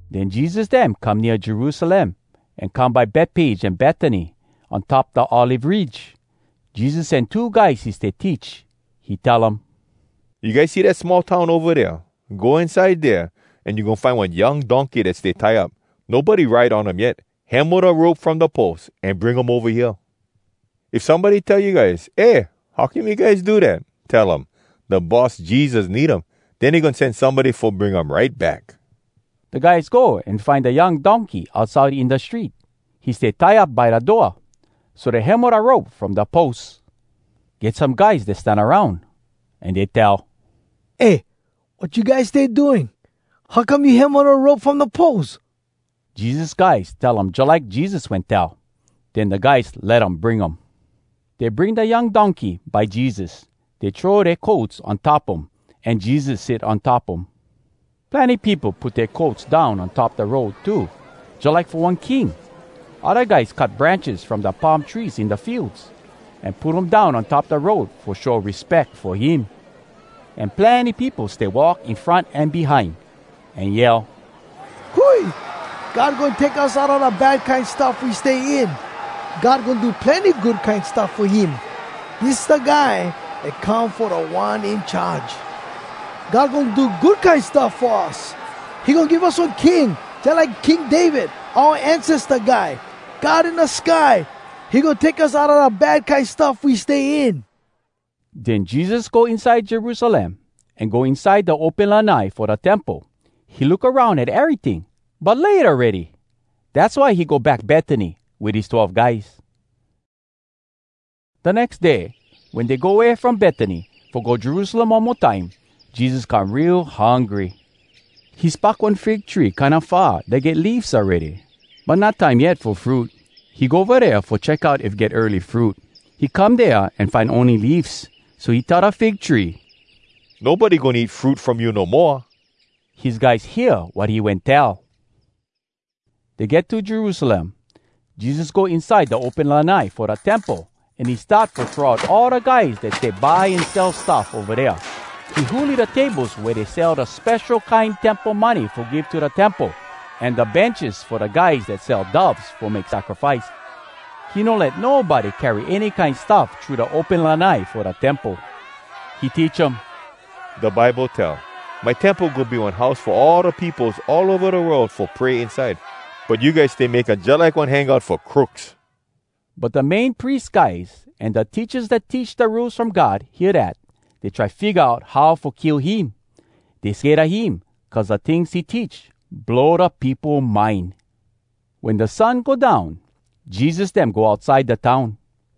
Den Jesus dem come nea Jerusalem an come by Betpage an Betany, on top da Olive Ridge. Jesus sen two guys he stay teach. He tell um, “You guys see dat small town ova dea? Go inside dea, an you goin find one young donkey dat stay tie up. Nobody ride on um yet. Hemo da rope from da pos, an bring um ova hea. If somebody tell you guys, ‘Eh, how come you guys do dat?’ tell um, ‘Da Boss Jesus need um. Den he goin sen somebody fo bring um right back.’” Da guys go an find da young donkey outside in da street. He stay tie up by da door, so dey hemo da rope from da pos. Get some guys dat stan aroun, an dey tell, “Eh! Wat you guys stay doing? How come you hemo da rope from da pos?” Jesus guys tell um jalike Jesus wen tell. Den da guys let um bring um. Dey bring da young donkey by Jesus. Dey throw dea coats on top um, an Jesus sit on top um. Plenny peopo put dea coats down on top da road too, jalike fo one king. Odda guys cut branches from da palm trees in da fields, an put um down on top da road fo show respeck fo him. An plenny peopo stay walk in front an behind, an yell “Hui! God goin take us outa da bad kine stuff we stay in! God goin do plenny good kine stuff fo him. Dis da guy dat come fo Da One In Charge! God goin do good kine stuff fo us! He goin give us one King jalike King David, Oua ancesta guy! God in da sky, He goin take us outa da bad kine stuff we stay in!” Den Jesus go inside Jerusalem, an go inside da open lanai fo da temple. He look aroun at eryting. But late awready, dass why he go back Betany wit his twelve guys. Da nex day, wen dey go way from Betany fo go Jerusalem one mo time, Jesus come real hungry. He spock one fig tree kinda far, dat get leafs awready, but not time yet fo fruit. He go ova dea fo check out if get early fruit. He come dea an find ony leafs. So he tell da fig tree, “Nobody goin eat fruit from you no moa!” His guys hear wat he wen tell. Dey get to Jerusalem. Jesus go inside da open lanai fo da temple, an he start fo throw out all da guys dat stay buy an sell stuff ova dea. He huli da tables wea dey sell da spesho kine temple money fo give to da temple, an da benches fo da guys dat sell doves fo make sacrifice. He no let nobody carry any kine stuff thru da open lanai fo da temple. He teach um, “Da Bible tell, ‘My temple goin be one house fo all da peopos all ova da world fo pray inside.’ But you guys stay make um jalike one hangout fo crooks!” But da Main Pries guys an da teachas dat teach da Rules From God hear dat. Dey try figga out how fo kill him. Dey sked a him, cuz da tings he teach, blow da peopo mind. Wen da sun go down, Jesus dem go outside da town.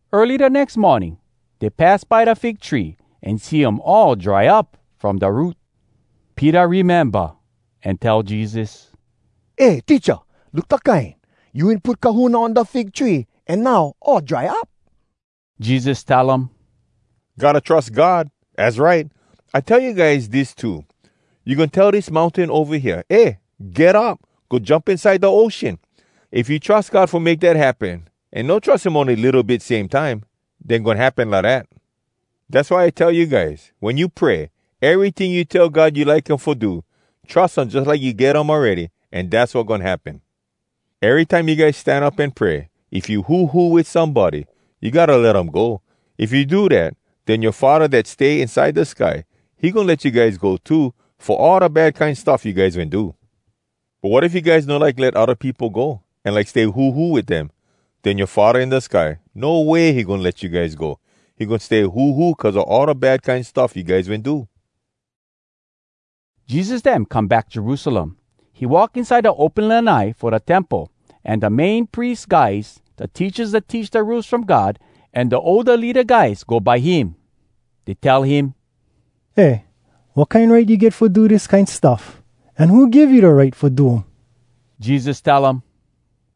Early da nex morning, dey pass by da fig tree, an see um all dry up from da root. Peter rememba, an tell Jesus, “Eh, Teacha! Look da kine! You wen put kahuna on da fig tree, an now, all dry up!” Jesus tell um, “Gotta trus God! Az right! I like tell you guys dis too: You goin tell dis mountain ova hea, ‘Eh, get up! Go jump inside da ocean!’ If you trus God fo make dat happen, an no trus um ony litto bit same time, den goin happen lidat. Dass why I tell you guys, wen you pray, eryting you tell God you like him fo do, trus him jalike you get um awready, an dass wat goin happen. Erytime you guys stan up an pray, if you huhu wit somebody, you gotta let um go. If you do dat, den yoa Faddah dat stay inside da sky, he goin let you guys go too, fo all da bad kine stuff you guys wen do. [But wat if you guys no like let odda peopo go, an like stay huhu wit dem? Den yoa Faddah in da sky, no way he goin let you guys go. He goin stay huhu cuz a all da bad kine stuff you guys wen do.]” Jesus dem come back Jerusalem. He walk inside da open lanai fo da temple, an da Main Pries guys, da teachas dat teach da Rules From God, an da older leada guys go by him. Dey tell him, “Eh, wat kine right you get fo do dis kine stuff? An who give you da right fo do um?” Jesus tell um,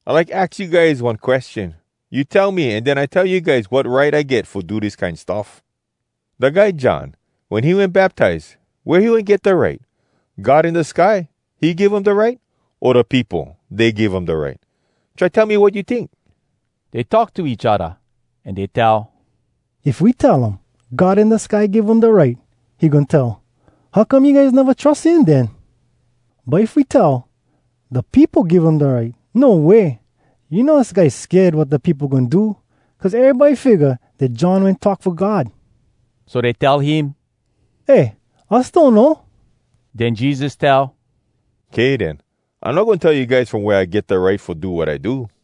“I like aks you guys one question. You tell me, an den I tell you guys wat right I get fo do dis kine stuff. Da guy John, wen he wen baptize, wea he wen get da right? God in da sky, he give um da right? O da peopo, dey give um da right? Try tell me wat you tink.” Dey talk to each odda, an dey tell, “If we tell um, ‘God in da sky give um da right,’ he goin tell, ‘How come you guys neva trus him den?’ But if we tell, ‘Da peopo give um da right,’ No way! You know us guys sked wat da peopo goin do, cuz erybody figga dat John wen talk fo God.” So dey tell him, “Eh, us donno.” Den Jesus tell, “Kay den, I no goin tell you guys from wea I get da right fo do wat I do.”